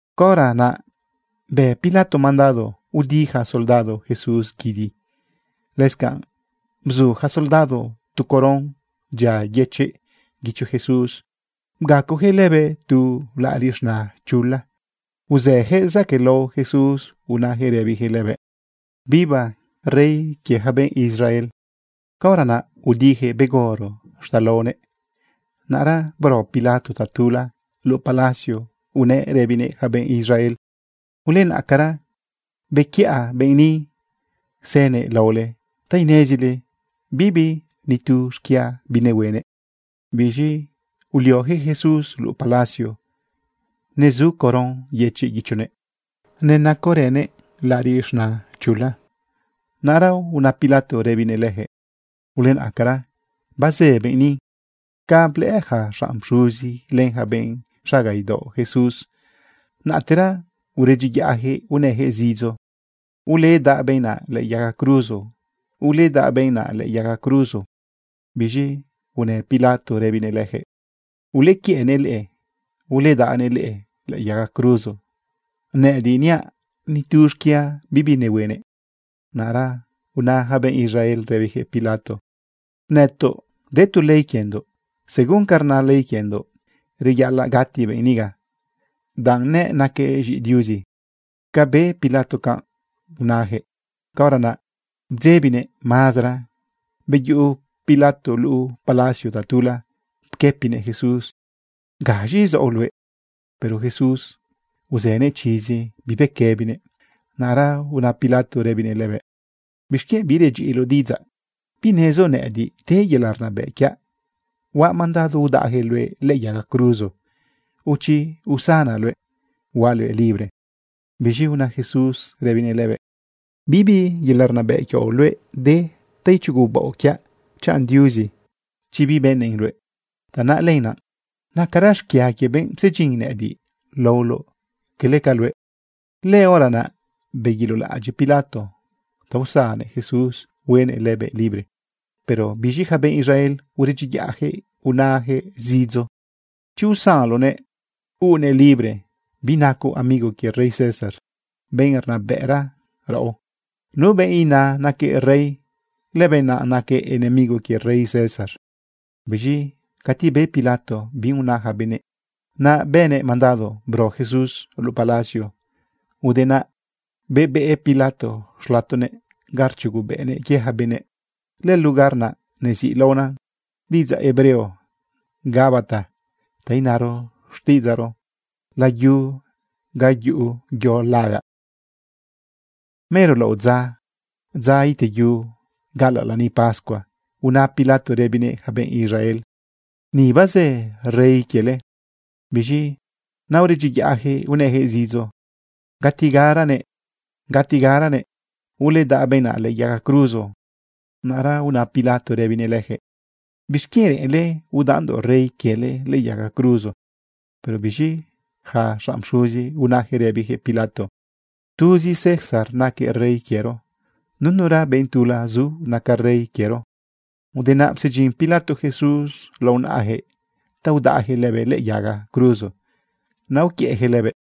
Caora naꞌ bë Pilato mandado udi yaca soldado Jesús guidi. Lëscanꞌ bzu yaca soldado tu coron dyia yëchiꞌ guicho Jesús, bgacoyaquëꞌ lëbëꞌ tu laꞌariꞌ z̃na chula, uzëyaquëꞌ zaquëꞌlao Jesús unayaquëꞌ rëbiyaquëꞌ lëbëꞌ: ―¡Viva rey quie yaca benꞌ Israel! Caora naꞌ udiyaquëꞌ begoro xtalaonëꞌ. Naꞌra bro Pilato tatula luꞌu palacio unëꞌ rëbinëꞌ yaca benꞌ Israel: ―Ulenaꞌcara, bequiꞌa benꞌ ni sënëꞌ laole ta inezile bibi nitu xquia binehuenëꞌ. Biz̃i ulioyaquëꞌ Jesús luꞌu palacio, nezu coron yëchiꞌ guichonëꞌ, nenacorënëꞌ laꞌariꞌ z̃na chula. Naꞌra una Pilato rëbinëꞌ leyaquëꞌ: ―Ulenaꞌcara bazë benꞌ ni. Ca blëꞌë yaca xanꞌ pxuzi len yaca benꞌ xaga idaoꞌ Jesús, naꞌtera uredyiyaꞌyaquëꞌ unëyaquëꞌ zidzo: ―¡Uledaꞌ benꞌ naꞌ lëꞌë yaga cruzo! ¡Uledaꞌ benꞌ naꞌ lëꞌë yaga cruzo! Biz̃i unë Pilato rëbinëꞌ leyaquëꞌ: ―Ulequiëꞌnëꞌ leꞌe, uledaꞌnëꞌ leꞌe lëꞌë yaga cruzo. Nëꞌëdiꞌ niaꞌ nitu xquia bibi nehuenëꞌ. Naꞌra una yaca benꞌ Israel rëbiyaquëꞌ Pilato: ―Nëtoꞌ de tu ley quiendoꞌ. Según ca rna ley quiendoꞌ, reyaꞌalaꞌ gati benꞌ niga, danꞌ nëꞌ naquëꞌ z̃iꞌi Diuzi. Ca be Pilato canꞌ unayaquëꞌ, caora naꞌ bdzebinëꞌ mazara. Beyuꞌu Pilato luꞌu palacio tatula pquëpinëꞌ Jesús: ―¿Gaz̃i zaoꞌ luëꞌ? Pero Jesús uzënëꞌ chizi, bibequëbinëꞌ. Naꞌra una Pilato rëbinëꞌ lëbëꞌ: ―¿Bixquienꞌ birudyiꞌiloꞌ diꞌidzaꞌ? ¿Binezoꞌ nëꞌëdiꞌ de yelaꞌ rnabëꞌ quiaꞌ huaꞌ mandado udaꞌyaquëꞌ luëꞌ lëꞌë yaga cruzo, o chi usanaꞌ luëꞌ, huaꞌ luëꞌ libre? Biz̃i una Jesús rëbinëꞌ lëbëꞌ: ―Bibi yelaꞌ rnabëꞌ quioꞌ luëꞌ de ta ichugubaoꞌ quiaꞌ chanꞌ Diuzi chi bibënnëꞌn luëꞌ. Tanaꞌ lenaꞌ nacara xquia quie benꞌ psedyin nëꞌëdiꞌ laoloꞌ, cala ca luëꞌ. Lëhora naꞌ beguilolaꞌadyiꞌ Pilato ta usannëꞌ Jesús, huenëꞌ lëbëꞌ libre. Pero biz̃i yaca benꞌ Israel uredyiyaꞌyaquëꞌ unayaquëꞌ zidzo: ―Chi usanloꞌnëꞌ huuꞌnëꞌ libre, binacoꞌ amigo quie rey César, benꞌ rnabëꞌra raꞌo. Nu benꞌ ina naquëꞌ rey, lëbenꞌ naꞌ naquëꞌ enemigo quie rey César. Biz̃i cati be Pilato bi una yaca benëꞌ, naꞌ bënëꞌ mandado bro Jesús luꞌu palacio. Ude naꞌ bebeꞌ Pilato xlatonëꞌ ga rchugobëꞌnëꞌ quie yaca benëꞌ. Lëlugar naꞌ neziꞌlaona diꞌidzaꞌ hebreo Gabata, ta inaro xtiꞌidzaꞌro: Layu ga yuꞌu yo lagaꞌ. Mero laꞌodza, dza iteyu gaꞌalaꞌ lani pascua, una Pilato rëbinëꞌ yaca benꞌ Israel: ―¡Ni bazë rey quiele! Biz̃i naꞌ uredyiyaꞌyaquëꞌ unëyaquëꞌ zidzo: ―¡Gatigaranëꞌ, gatigaranëꞌ! ¡Uledaꞌ benꞌ naꞌ lëꞌë yaga cruzo! Naꞌra una Pilato rëbinëꞌ leyaquëꞌ: ―¿Bixquienꞌ reꞌenle udaꞌndoꞌ rey quiele lëꞌë yaga cruzo? Pero biz̃i yaca xanꞌ pxuzi, unayaquëꞌ rëbiyaquëꞌ Pilato: ―Tuzi César naquëꞌ rey quiero. Nunura benꞌ tula zu naca rey quiero. Ude naꞌ psedyin Pilato Jesús lao naꞌayaquëꞌ ta udaꞌyaquëꞌ lëbëꞌ lëꞌë yaga cruzo, naꞌ uquiëꞌyaquëꞌ lëbëꞌ.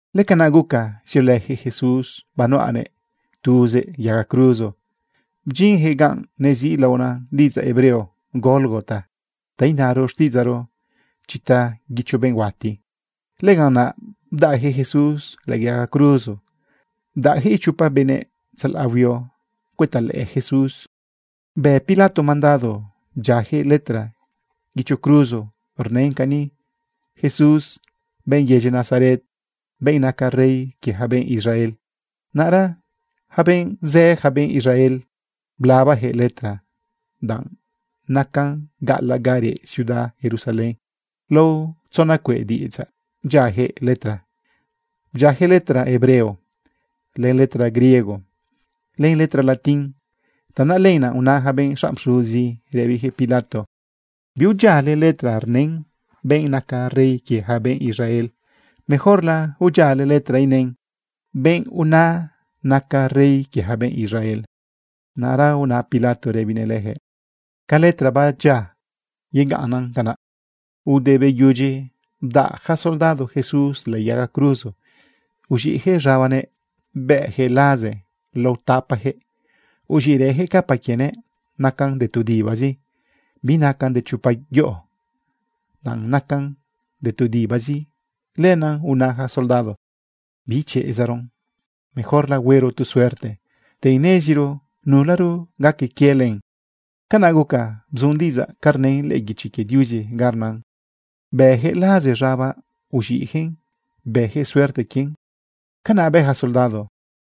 Lëcanaꞌ guca ziolëyaquëꞌ Jesús banuꞌanëꞌ tuzëꞌ yaga cruzo, bdyinyaquëꞌ ganꞌ neziꞌlaona diꞌidzaꞌ hebreo Gólgota, ta inaro xtiꞌidzaꞌro: Chita guicho benꞌ huati. Lëganꞌ naꞌ bdaꞌyaquëꞌ Jesús lëꞌë yaga cruzo. Bdaꞌyaquëꞌ ichopa benëꞌ tzalaꞌ huio cuëta lëꞌë Jesús. Bë Pilato mandado bdyiayaquëꞌ letra guicho cruzo rnën cani: “Jesús, benꞌ yedyi Nazaret, benꞌ naca rey quie yaca benꞌ Israel.” Naꞌra yaca benꞌ zë, yaca benꞌ Israel blabayaquëꞌ letra, danꞌ nacan gaꞌalaꞌ ga reꞌ ciudad Jerusalén. Lao tzona cueꞌ diꞌidzaꞌ bdyiayaquëꞌ letra. Bdyiayaquëꞌ letra hebreo, len letra griego, len letra latín. Tanaꞌ lenaꞌ una yaca benꞌ xanꞌ pxuzi rëbiyaquëꞌ Pilato: ―Biudyiale letra rnën “Benꞌ naca rey quie yaca benꞌ Israel.” Mejorla udyiale letra inën “Benꞌ una nacaꞌ rey quie yaca benꞌ Israel.” Naꞌra una Pilato rëbinëꞌ leyaquëꞌ: ―Ca letra babdyiaꞌ, yegaꞌnnan canaꞌ. Ude beyudyi udaꞌ yaca soldado Jesús lëꞌë yaga cruzo, uz̃iꞌyaquëꞌ z̃abanëꞌ bëꞌyaquëꞌ laze lao tapayaquëꞌ. Uz̃iꞌrëyaquëꞌ capa quienëꞌ. Nacan de tu dibazi, binacan de chopa yoꞌo. Danꞌ nacan de tu dibazi, lenaꞌ una yaca soldado: ―Bichezaron. Mejorla huero tu suerte ta ineziro nularo gaca quie len. Canaꞌ guca bzun diꞌidzaꞌ ca rnën lëꞌë guichi quie Diuzi ga rnan: “Bëꞌyaquëꞌ laze z̃abaꞌ, uziꞌyaquëꞌn. Bëyaquëꞌ suerte quien.” Canaꞌ bë yaca soldado.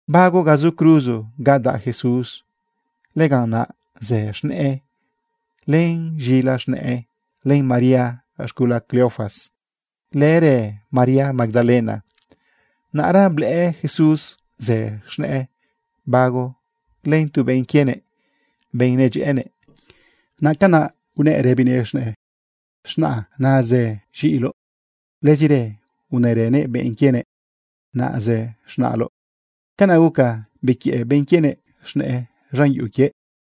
Bago ga zu cruzo ga daꞌ Jesús, lëganꞌ naꞌ zë z̃nëꞌë, len z̃ila z̃nëꞌë, len María z̃gula Cleofas, lërë María Magdalena. Naꞌra blëꞌë Jesús zë z̃nëꞌë bago len tu benꞌ quienëꞌ, benꞌ nedyëꞌënëꞌ. Naꞌ nacanꞌ unëꞌ rëbinëꞌ z̃nëꞌë: ―Z̃naꞌa, naꞌ zë z̃iꞌiloꞌ. Lëzirë unërënëꞌ benꞌ quienëꞌ: ―Naꞌ zë z̃naꞌloꞌ. Canaꞌ guca bequiëꞌ benꞌ quienëꞌ z̃nëꞌë z̃an yuꞌu quiëꞌ.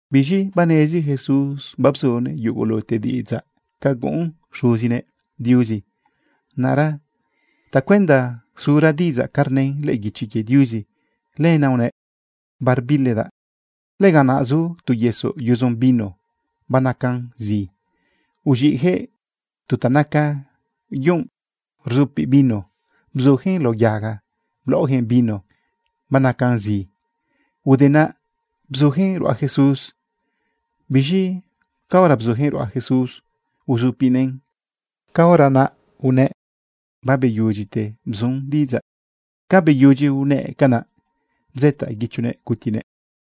Biz̃i banezi Jesús babzunëꞌ yugulute diꞌidzaꞌ ca guꞌun Xuzinëꞌ Diuzi. Naꞌra tacuenda zuran diꞌidzaꞌ ca rnën lëꞌë guichi quie Diuzi, lenaꞌ unëꞌ: ―Barbilidaꞌ. Lëganꞌ naꞌ zu tu yesoꞌ yudzo vino banacan zi. Uz̃iꞌyaquëꞌ tu ta naca yunꞌ rzupiꞌ vino, bzuyaquëꞌn lao yaga, blaꞌoyaquëꞌn vino banacan zi. Ude naꞌ bzuyaquëꞌn ruꞌa Jesús. Biz̃i caora bzuyaquëꞌn ruꞌa Jesús uzupinëꞌn, caora naꞌ unëꞌ: ―Babeyudyite bzun diꞌidzaꞌ. Ca beyudyi unëꞌ canaꞌ, bzëtaꞌ guichonëꞌ gutinëꞌ.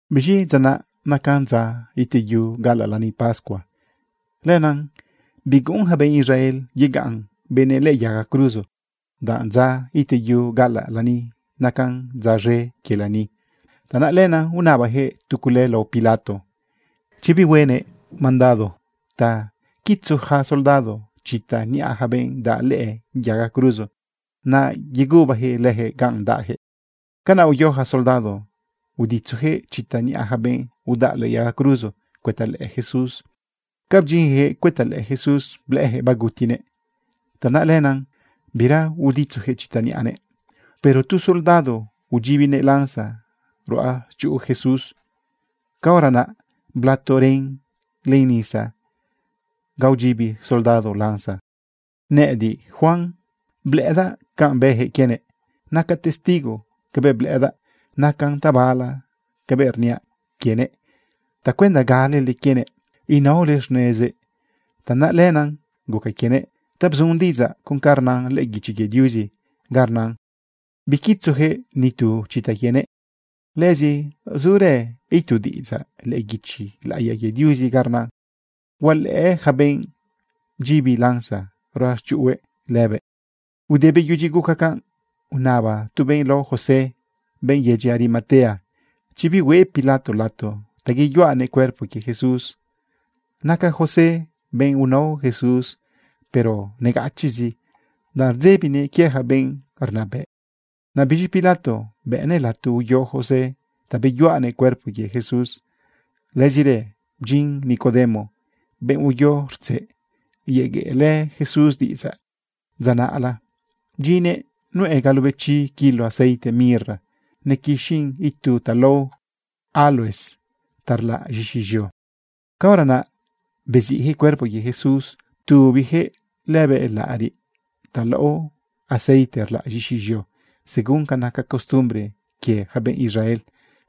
Biz̃i dza naꞌ nacan dza iteyu gaꞌalaꞌ lani pascua. Lenaꞌ biguꞌun yaca benꞌ Israel yegaꞌn benëꞌ lëꞌë yaga cruzo, danꞌ dza iteyu gaꞌalaꞌ lani, nacan dza z̃e quie lani. Tanaꞌ lenaꞌ unabayaquëꞌ tu cule lao Pilato chi bihuenëꞌ mandado ta quitzu yaca soldado chita niꞌa yaca benꞌ daꞌ lëꞌë yaga cruzo, naꞌ yegubayaquëꞌ leyaquëꞌ ganꞌ daꞌyaquëꞌ. Canaꞌ uyo yaca soldado uditzuyaquëꞌ chita niꞌa yaca benꞌ udaꞌ lëꞌë yaga cruzo cuëta lëꞌë Jesús. Ca bdyinyaquëꞌ cuëta lëꞌë Jesús, blëꞌëyaquëꞌ bagutinëꞌ. Tanaꞌ lenaꞌ bira uditzuyaquëꞌ chita niꞌanëꞌ. Pero tu soldado udyibinëꞌ lanza ruꞌachuꞌu Jesús. Caora naꞌ blato ren len nisa ganꞌ udyibi soldado lanza. Nëꞌëdiꞌ, Juan, blëꞌëdaꞌ canꞌ bëyaquëꞌ quienëꞌ. Nacaꞌ testigo cabëꞌ blëꞌëdaꞌ. Nacan tabala cabëꞌ rniaꞌ quienëꞌ tacuenda galele quienëꞌ inaole xnezëꞌ. Tanaꞌ lenaꞌ guca quienëꞌ ta bzun diꞌidzaꞌ con ca rnan lëꞌë guichi quie Diuzi ganꞌ rnan: “Biquitzuyaquëꞌ ni tu chita quienëꞌ.” Lëzi zurë itu diꞌidzaꞌ lëꞌë guichi laꞌiya quie Diuzi ga rnan: “Hualëꞌë yaca benꞌ bdyibi lanza ruꞌachuꞌuhue lëbëꞌ.” Ude beyudyi guca canꞌ, unaba tu benꞌ lao José, benꞌ yedyi Arimatea, chi bihueꞌ Pilato lato ta yeyuꞌanëꞌ cuerpo quie Jesús. Naca José benꞌ unao Jesús, pero negachiꞌzi, danꞌ rdzebinëꞌ quie yaca benꞌ rnabëꞌ. Naꞌ biz̃i Pilato bëꞌnëꞌ lato uyo José ta beyuꞌanëꞌ cuerpo quie Jesús. Lëzirë bdyin Nicodemo, benꞌ uyo rtzeꞌ yegueꞌlë Jesús diꞌidzaꞌ dza naꞌla. Bdyinnëꞌ nuꞌë galobechi kilo aceite mirra nequixin itu ta lao áloes ta rlaꞌn z̃ixi z̃eo. Caora naꞌ beziꞌyaquëꞌ cuerpo quie Jesús, ptubiyaquëꞌ lëbëꞌ laꞌariꞌ ta laꞌo aceite rlaꞌ z̃ixi z̃eo, según ca naca costumbre quie yaca benꞌ Israel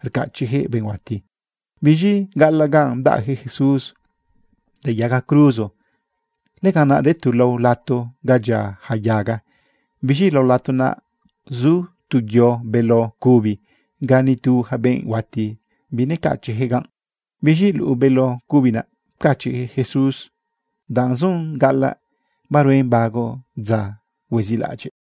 rcachiꞌyaquëꞌ benꞌ huati. Biz̃i gaꞌalaꞌ ganꞌ bdaꞌyaquëꞌ Jesús lëꞌë yaga cruzo, lëganꞌ naꞌ de tu lao lato ga dyia yaca yaga. Biz̃i lao lato naꞌ, zu tu yo beló cubi ga nitu yaca benꞌ huati binecachiꞌyaquëꞌ ganꞌ. Biz̃i luꞌu beló cubi naꞌ, pcachiꞌyaquëꞌ Jesús danꞌ zun gaꞌalaꞌ baruen bago dza huezilaꞌadyiꞌ.